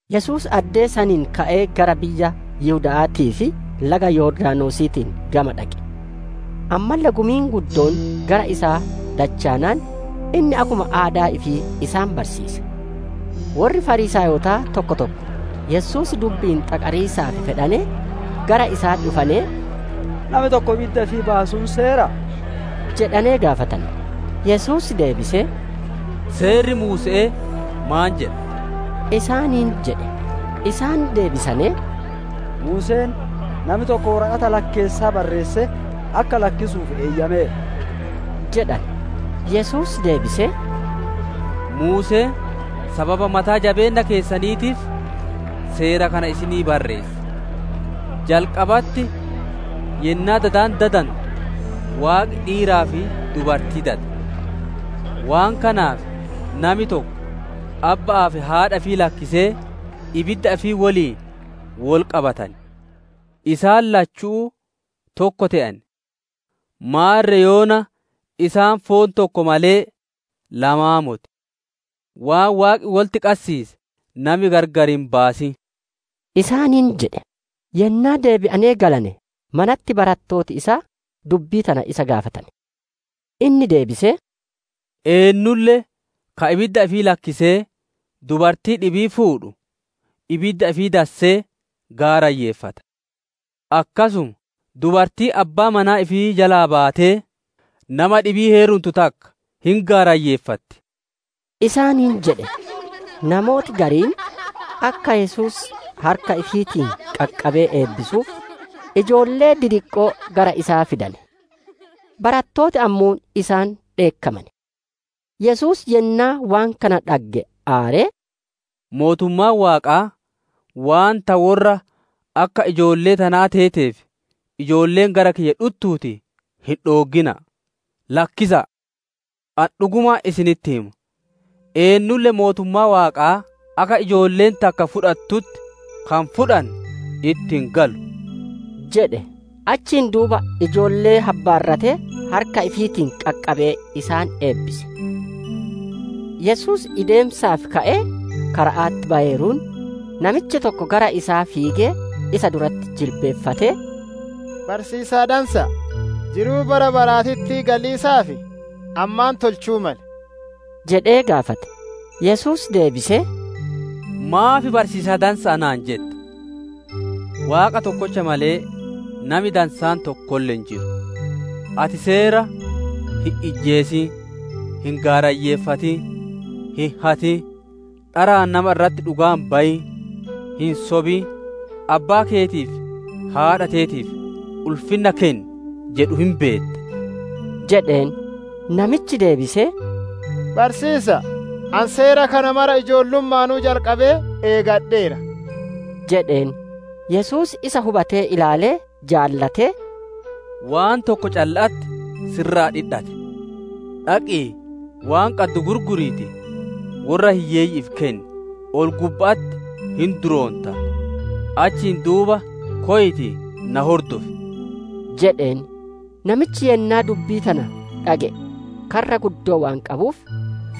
Yesuus addee sanii ka'ee gara biyya Yihuda'aatii fi laga Yordaanosiitiin gama dhaqe. Ammalle gumiin guddoon gara isaa dachaanaan, inni akkuma aadaa ifii isaan barsiise. Worri Fariisaayotaa tokko tokko Yesuus dubbi'iin xaqariisaaf fedhanee, gara isaa dhufanee, «Nami tokko ibidda ifii baasuun seeraa?» jedhanee gaafatane. Yesuus deebisee, «Seerri Muuse'ee maan jedha?» isaaniin jedhe. Isaan deebisanee, «Muuseen ‹Nami tokko woraqata lakkeessaa barreessee akka lakkisuuf eeyyameera›» jedhane. Yesuus deebisee, «Muuseen sababa mataa jabeenna keessaniitiif seera kana isinii barreesse. Jalqabatti yennaa dadi dadantu, ‹Waaqi dhiiraa fi dubartii dade;› ‹Waan kanaaf nami tokko abba'aa fi haadha ifii lakkisee ibidda ifii woliin wol qabatan. Isaan lachuu tokko te'an.› Maarre yoona isaan foon tokko malee lamaanii moti. Waan Waaqi wolitti qassiise nami gargar hin baasin!» isaaniin jedhe. Yennaa deebi'anee galane, manatti barattooti isaa dubbii tana isa gaafatane. Inni deebisee, «Eennulle ka ibidda ifii lakkisee dubartii dhibii fuudhu, ibidda ifii dassee gaarayyeeffata. Akkasuma dubartiin abbaa manaa ifii jalaa baatee, nama dhibii heerumtu takka hin gaarayyeeffatti» isaaniin jedhe. Namooti gariin akka Yesuus harka ifiitiin qaqqabee eebbisuuf, ijoollee didiqqoo gara isaa fidane. Barattooti ammoo isaan dheekkamane. Yesuus yennaa waan kana dhagge aaree, «Mootummaan Waaqaa waan ta worra akka ijoollee tanaa teeteef, ijoolleen gara kiyya dhuttuutii, hin dhooggina'aa lakkisa'a! Ani dhugumaan isinitti hima; eennulle mootummaa Waaqaa akka ijoolleen takka fudhattutti ka hin fudhanne, itti hin galu» jedhe. Achiin duuba ijoollee habbaarratee harka ifiitiin qaqqabee, isaan eebbise. Yesuus ideemiisaaf ka'ee kara'atti bayeeruun, namichi tokko gara isaa fiigee, isa duratti jilbiiffatee, «Barsiisaa dansa'a! Jiruu bara baraatitti galiisaaf ani maan tolchu'uu male?» jedhee gaafate. Yesuus deebisee, «Maaf barsiisaa dansa'a naan jetta? Waaqa tokkocha malee, nami dansaan tokkolle hin jiru. Ati seera ‹Hin ijjeesin, hin gaarayyeeffatin, hin hatin, dharaan nama irratti dhugaa hin bayin, hin sobin, abbaa keetii fi haadha teetiif ulfinna kenni› jedhu hin beetta» jedheen. Namichi deebisee, «Barsiisa'a! Ani seera kana mara ijoollumma'aanuu jalqabee eegadheera» jedheen. Yesuus isa hubatee ilaalee jaalatee, «Waan tokko calla'atti si irraa dhidhate. Dhaqii, waan qaddu gurguriitii, worra hiyyeeyyi'iif kenni, ol-gubba'atti hin duroontaa; achiin duuba koyiitii na hordofi!» jedheen. Namichi yennaa dubbii tana dhage'ee karra guddoo waan qabuuf,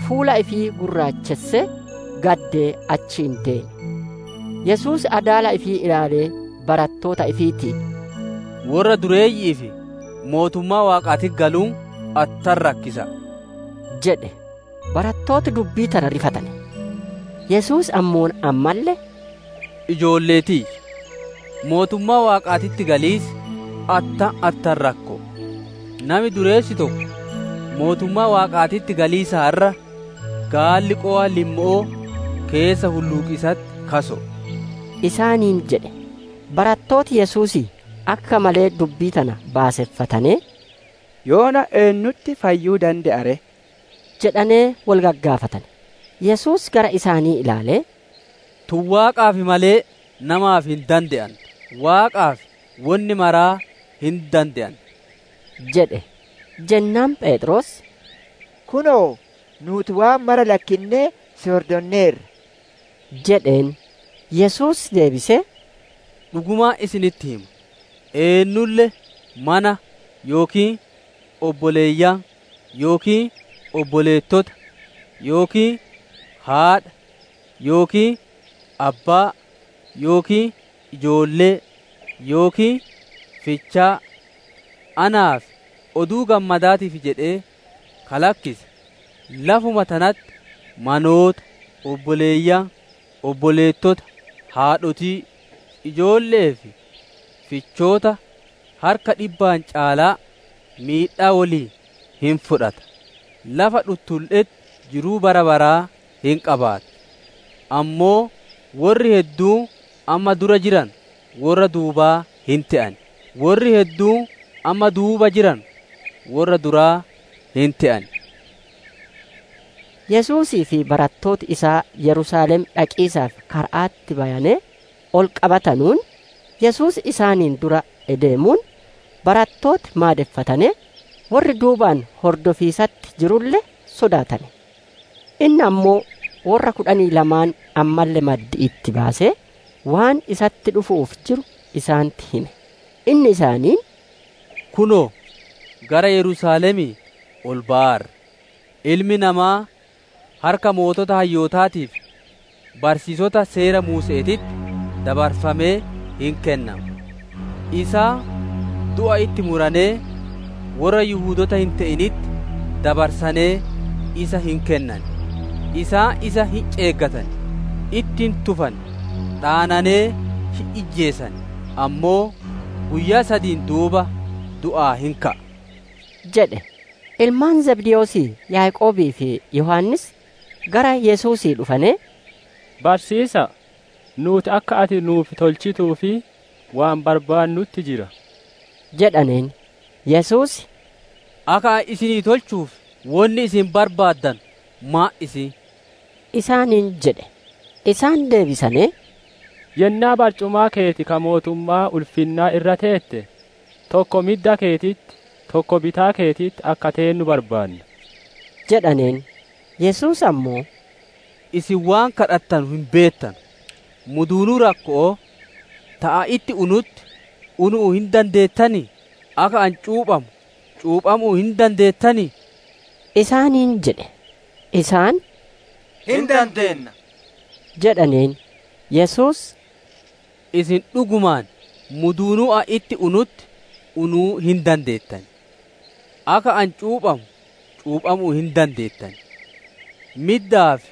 fuula ifii gurraachessee, gaddee achii deeme. Yesuus adaala ifii ilaalee barattoota ifiitiin, «Worra dureeyyi'iif mootummaa Waaqaatitti galuun attam rakkisa'a!» jedhe. Barattooti dubbii tana rifatane. Yesuus ammoo ammalle, «Ijoollee tiyya mootummaa Waaqaatitti galiisi attam attam rakko'o! Nami dureessi tokko mootummaa Waaqaatitti galiisaan irra gaalli qowa limmo'oo keessa hulluuqiisatti kaso'oo» isaaniin jedhe. Barattooti Yesuusii akka malee dubbii tana baaseffatanee, «Yoona eennutti fayyuu dande'a ree?» jedhanee wol gagaafatane. Yesuus gara isaanii ilaalee, «Tun Waaqaaf malee namaaf hin dande'antu; Waaqaaf wonni maraa hin dande'anti» jedhe. Jennaan Pheexroos, «Kunoo, nuuti waan maraa lakkinnee si hordonneerra» jedheen. Yesuus deebisee, «Dhugumaan isinitti hima; eennulle mana yookiin obboleeyyan yookiin obboleettota yookiin haadha yookiin abbaa yookiin ijoollee yookiin fichaa anaa fi Oduu Gammadaatiif jedhee ka lakkise, lafuma tanatti manoota, obboleeyyan, obboleettota, haadhotii, ijoolle'ee fi fichoota harka dhibbaan caalaa miidhaa woliin hin fudhata; lafa dhuttulle'etti jiruu bara baraa hin qabaata. Ammoo worri hedduun amma dura jiranu, worra duubaa hin te'an; worri hedduun amma duuba jiranu worra duraa hin te'an» jedhe. Yesuusii fi barattooti isaa Yerusaalem dhaqiisaaf kara'atti bayanee ol qabatanuun, Yesuus isaaniin dura ideemuun, barattooti maadeffatanee, worri duubaan hordofiisatti jirulle sodaatane. Inni ammoo worra kudhanii lamaan ammalle maddi'itti baasee, waan isatti dhufu'uuf jiru isaanitti hime. Inni isaaniin «Kunoo, gara Yerusaalemii ol bayaarra; Ilmi Namaa harka sooreyyii hayyootaatii fi barsiisota Seera Muuse'eetitti dabarfamee hin kennama. Isaan du'a itti muranee, worra Yihudoota hin te'initti dabarsanee isa hin kennan; isaan isa hin ceeggatan, itti hin tufan, dhaananee hin ijjeesan; ammoo guyyaa sadiin duuba du'aa hin ka'a» jedhe. Ilmaan Zabdewoosii Yaaqoobii fi Yohaannis gara Yesuusii dhufanee, «Barsiisa'a! Nuuti akka ati nuuf tolchituuf waan barbaannutti jira» jedhaneen. Yesuus, «Akka ani isinii tolchuuf wonni isin barbaaddanu maan isiin?» isaaniin jedhe. Isaan deebisanee, «Yennaa barcumaa keeti ka mootummaa ulfinnaa irra teette, tokko midda keetitti, tokko bitaa keetitti akka teennu barbaanna» jedhaneen. Yesuus ammoo, «Isin waan gaafattanu hin beettanu! Muduunuu rakko'oo ta ani itti unutti unuu hin dandeettanii? Akka ani cuuphamu cuuphamuu hin dandeettanii?» isaaniin jedhe. Isaan, «Hin dandeenna» jedhaneen. Yesuus, «Isin dhugumaan muduunuu ani itti unutti unuu hin dandeettan, akka ani cuuphamu cuuphamuu hin dandeettan. Middaa fi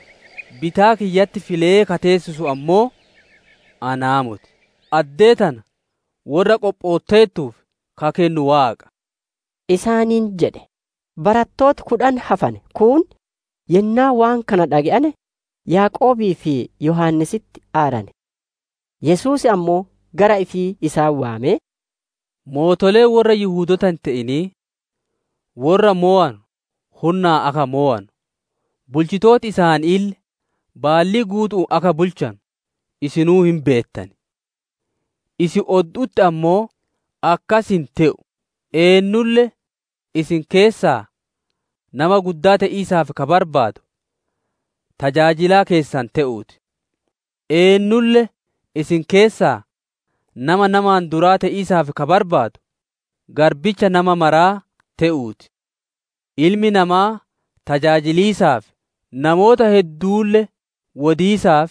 bitaa kiyyatti filee ka teessisu ammoo anaa moti; addee tana worra qophootteertuuf ka kennu Waaqa» isaaniin jedhe. Barattooti kudhan hafane kuun yennaa waan kana dhage'ane, Yaaqoobii fi Yohaannisitti aarane. Yesuus ammoo gara ifii isaan waamee, «Mootoleen worra Yihudoota hin te'inii, worra mowanu hunnaan akka mowanu, bulchooti isaaniille baallii guutu'uun akka bulchanu isinuu hin beettan. Isin oddu'utti ammoo akkas hin te'u; eennulle isin keessaa nama guddaa te'iisaaf ka barbaadu, tajaajilaa keessan te'uu ti. Eennulle isin keessaa nama namaan duraa te'iisaaf ka barbaadu, garbicha nama maraa te'uu ti. Ilmi namaa tajaajiliisaaf, namoota hedduulle wodiisaaf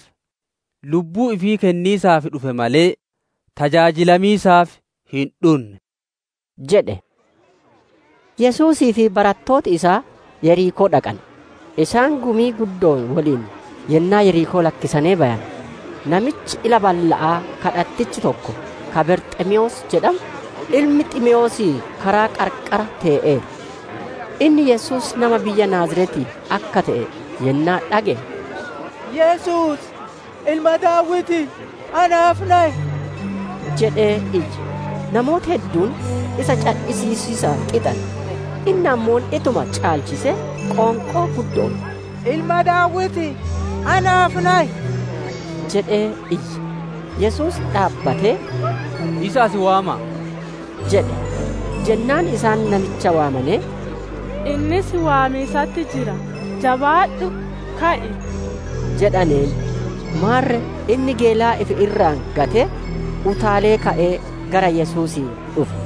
lubbuu ifii kenniisaaf dhufe malee, tajaajilamiisaaf hin dhunne» jedhe. Yesuusii fi barattooti isaa Yerikoo dhaqane. Isaan gumii guddo'oon woliin yennaa Yerikoo lakkisanee bayane, namichi ila balla'aa kadhatichi tokko ka Barxiimewoos jedhamu, ilmi Ximeewoosii karaa qarqara tee'eera. Inni Yesuus nama biyya Naaziretii akka te'e yennaa dhage'e, «Yesuus! Ilma Daawitii naaf nayi!» jedhee iyye. Namooti hedduun isa cadhisiisiisaaf xixane; inni ammoo ittuma caalchisee qoonqoo guddo'oon, «Ilma Daawitii, naaf nayi» jedhee iyye. Yesuus dhaabbatee, «Isa as waama'a!» jedhe. Jennaan isaan namicha waamanee, «Inni si waamiisatti jira, jabaadhu! Ka'i!» jedhaneen. Maarre inni geelaa ifi irraa gatee, utaalee ka'ee, gara Yesuusii dhufe.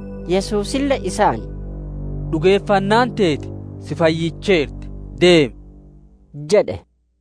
Yesuusille isaan, «Dhugeeffannaan teeti si fayyicheerti deemi!» jedhe.